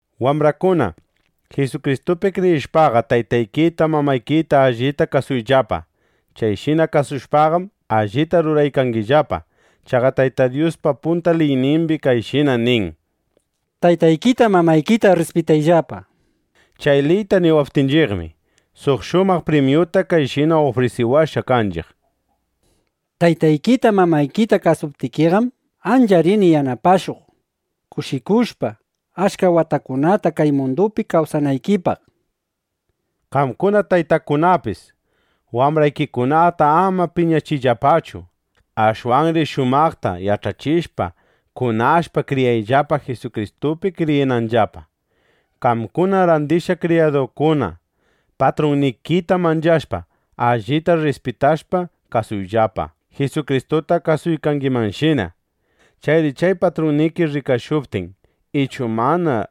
Wambrakuna, Jisukristupi kriyishpaqa, taytaykita, mamaykita allita kasuyllapa. Chayshina kasushpaqam, allita ruraykangillapa. Chaqa Tayta Dyuspa punta liyninmi kayshina nin: “Taytaykita, mamaykita rrispitayllapa”, nishpa. Chay liyta niwaqninchiqmi, suq shumaq primyuta kayshina ufrisiwashqa kanchiq: “Taytaykita, mamaykita kasuptikiqam, ancha rini yanapashuq, kushikushpa, achka watakunata kay mundupi kawsanaykipaq”, nishpa. Qamkuna taytakunapis, wambraykikunata ama piñachiyllapachu. Ashwanri shumaqta yach'achishpa kunashpa, kriyayllapa, Jisukristupi kriyinanllapa. Qamkuna randishqa kriyadukuna, patrunnikita manchashpa, allita rrispitashpa kasuyllapa, Jisukristuta kasuykangimanshina. Chayri chay patrunniki rikashuptin ichu mana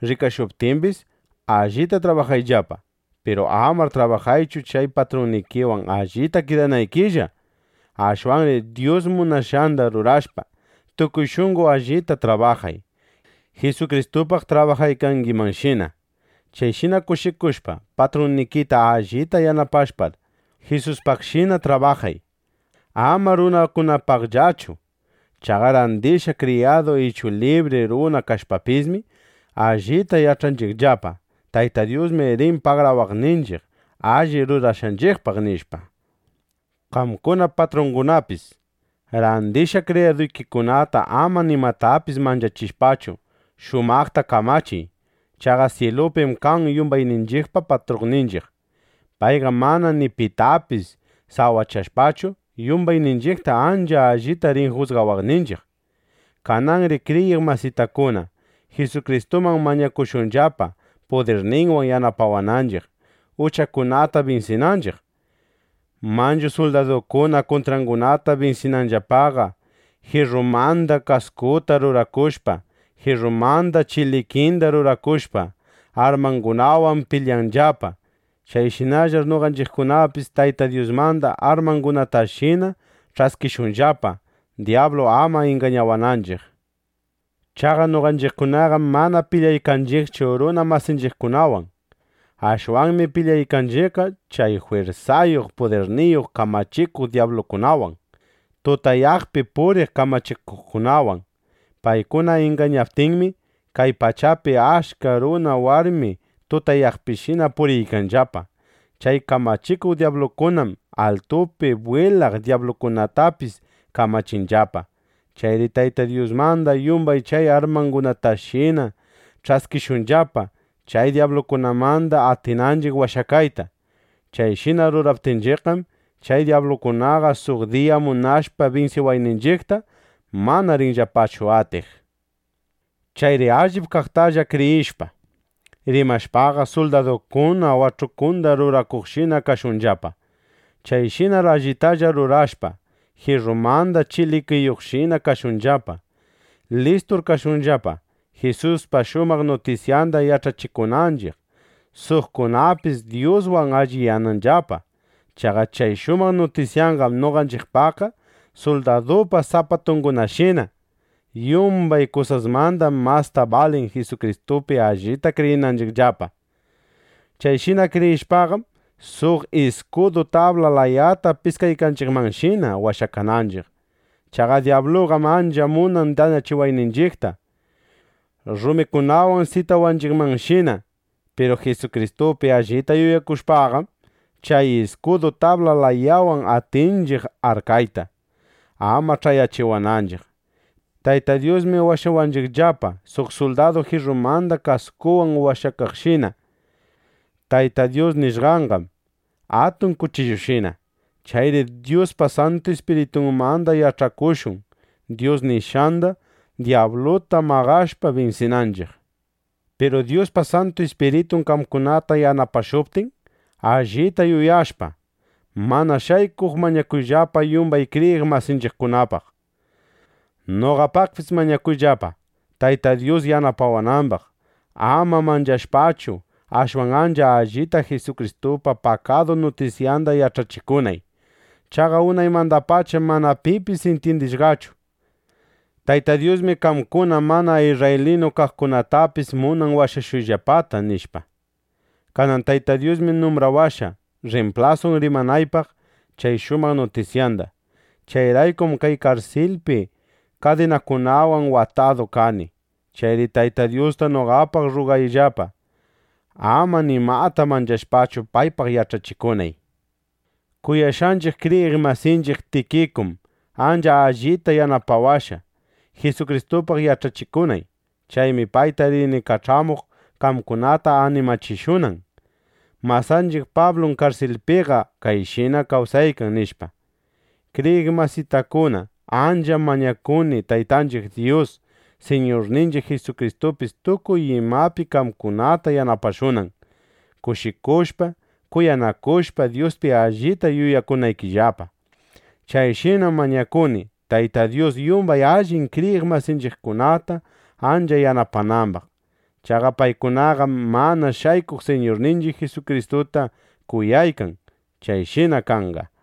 rikashuptimbis, allita trabajayllapa. Piru amar trabajaychu chay patrunnikiwan allita kidanaykillaqa. Ashwanri Dyus munashqanda rurashpa, tukuy shunqo allita trabajay, Jisukristupaq trabajaykangimanshina. Chayshina kushikushpa, patrunnikita allita yanapashpaqar, Jisuspaqshina trabajay, ama runakunapaqllachu. Chaqa randishqa kriyadu ichu libri runa kashpapismi, allita yach'anchiqllapa: Tayta Dyusmi rin pagarawaqninchiq alli rurashqanchiqpaq, nishpa. Qamkuna patrungunapis, randishqa kriyaduykikunata ama nimatapis manchachishpachu, shumaqta kamachiy. Chaqa syilupim kan yumbayninchiqpa patrunninchiq. Payqam mana ni pitapis sawachashpachu, yumbayninchiqta ancha allita rin jusgawaqninchiq. Kananri kriyiq masitakuna, Jisukristuman mañakushunllapa, pudirninwan yanapawaptinchiq, uchakunata binsinanchiq. Manchu suldadukuna kuntrangunata binsinanllapaqa, jirrumanda kaskuta rurakushpa, jirrumanda chilikinda rurakushpa, armangunawan pilyanllapa. Chayshinallar noqanchiqkunapis Tayta Dyusmanda armangunatashina ch'askishunllapa, dyablu ama ingañawananchiq. Chaqa noqanchiqkunaqam mana pilyaykanchiqchu runa masinchiqkunawan. Ashwanmi pilyaykanchiqqa chay jwirsayuq, pudirniyuq, kamachikuq dyablukunawan, tutayaqpi puriq kamachikuqkunawan. Paykuna ingañaptinmi, kay pachapi achka runa warmi tutayaqpishina puriykanllapa. Chay kamachikuq dyablukunam altupi bwilaq dyablukunatapis kamachinllapa. Chayri Tayta Dyusmanda yumbay chay armangunatashina ch'askishunllapa, chay dyablukunamanda atinanchiq washakayta. Chayshina ruraptinchiqqam, chay dyablukunaqa suq diya munashpa binsiwayninchiqta, mana rinllapachu atiq. Chayri allip kaqtalla kriyishpa, rimashpaqa, suldadukuna wach'ukunda rurakuqshina kashunllapa. Chayshinar allitalla rurashpa, jirrumanda chilikiyuqshina kashunllapa. Listur kashunllapa, Jisuspa shumaq nutisyanda yach'achikunanchiq, suqkunapis Dyuswan alliyananllapa. Chaqa chay shumaq nutisyanqam noqanchiqpaqqa suldadupa sapatungunashina. Yumbay kusasmandam masta balin Jisukristupi allita kriyinanchiqllapa. Chayshina kriyishpaqam, suq iskudu tabla layata piskaykanchiqmanshina washakananchiq. Chaqa dyabluqam ancha munan dañachiwayninchiqta, rumikunawan sitawanchiqmanshina. Piru Jisukristupi allita yuyakushpaqam, chay iskudu tabla layawan atinchiq arkayta, ama ch'ayachiwananchiq. Tayta Dyusmi washawanchiqllapa, suq suldadu jirrumanda kaskunwan washakaqshina. Tayta Dyus nishqanqam atun kuchillushina. Chayri Dyuspa Santu Ispiritunmanda yach'akushun Dyus nishqanda, dyabluta maqashpa, binsinanchiq. Piru Dyuspa Santu Ispiritun qamkunata yanapashuptin, allita yuyashpa, mana shaykuq mañakuyllapa yumbay kriyiq masinchiqkunapaq. Noqapaqpis mañakuyllapa, Tayta Dyus yanapawanambaq, ama manchashpachu, ashwan ancha allita Jisukristupa pakadu nutisyanda yach'achikunay. Chaqa unaymandapacham mana pipis intyindishqachu: (Tayta Dyusmi qamkuna mana isrraylinu kaqkunatapis munan washashuyllapata, nishpa.) Kanan Tayta Dyusmi numbrawashqa, rrimplasun rimanaypaq chay shumaq nutisyanda. Chayraykum kay karsilpi kadinakunawan watadu kani. Chayri Tayta Dyusta noqapaq rrugayllapa, ama nimata manchashpachu, paypaq yach'achikunay. Kuyashqanchiq kriyiq masinchiq Tikikum ancha allita yanapawashqa, Jisukristupaq yach'achikunay. Chaymi payta rini kach'amuq, qamkunata animachishunan: “Masanchiq Pablum karsilpiqa kayshina kawsaykan”, nishpa. Kriyiq masitakuna, ancham mañakuni, Taytanchiq Dyus, Siñurninchiq Jisukristupis tukuy imapi qamkunata yanapashunan, kushikushpa, kuyanakushpa, Dyuspi allita yuyakunaykillapa. Chayshinam mañakuni, Tayta Dyus yumbay allin kriyiq masinchiqkunata ancha yanapanambaq. Chaqa paykunaqam mana shaykuq Siñurninchiq Jisukristuta kuyaykan. Chayshina kanqa.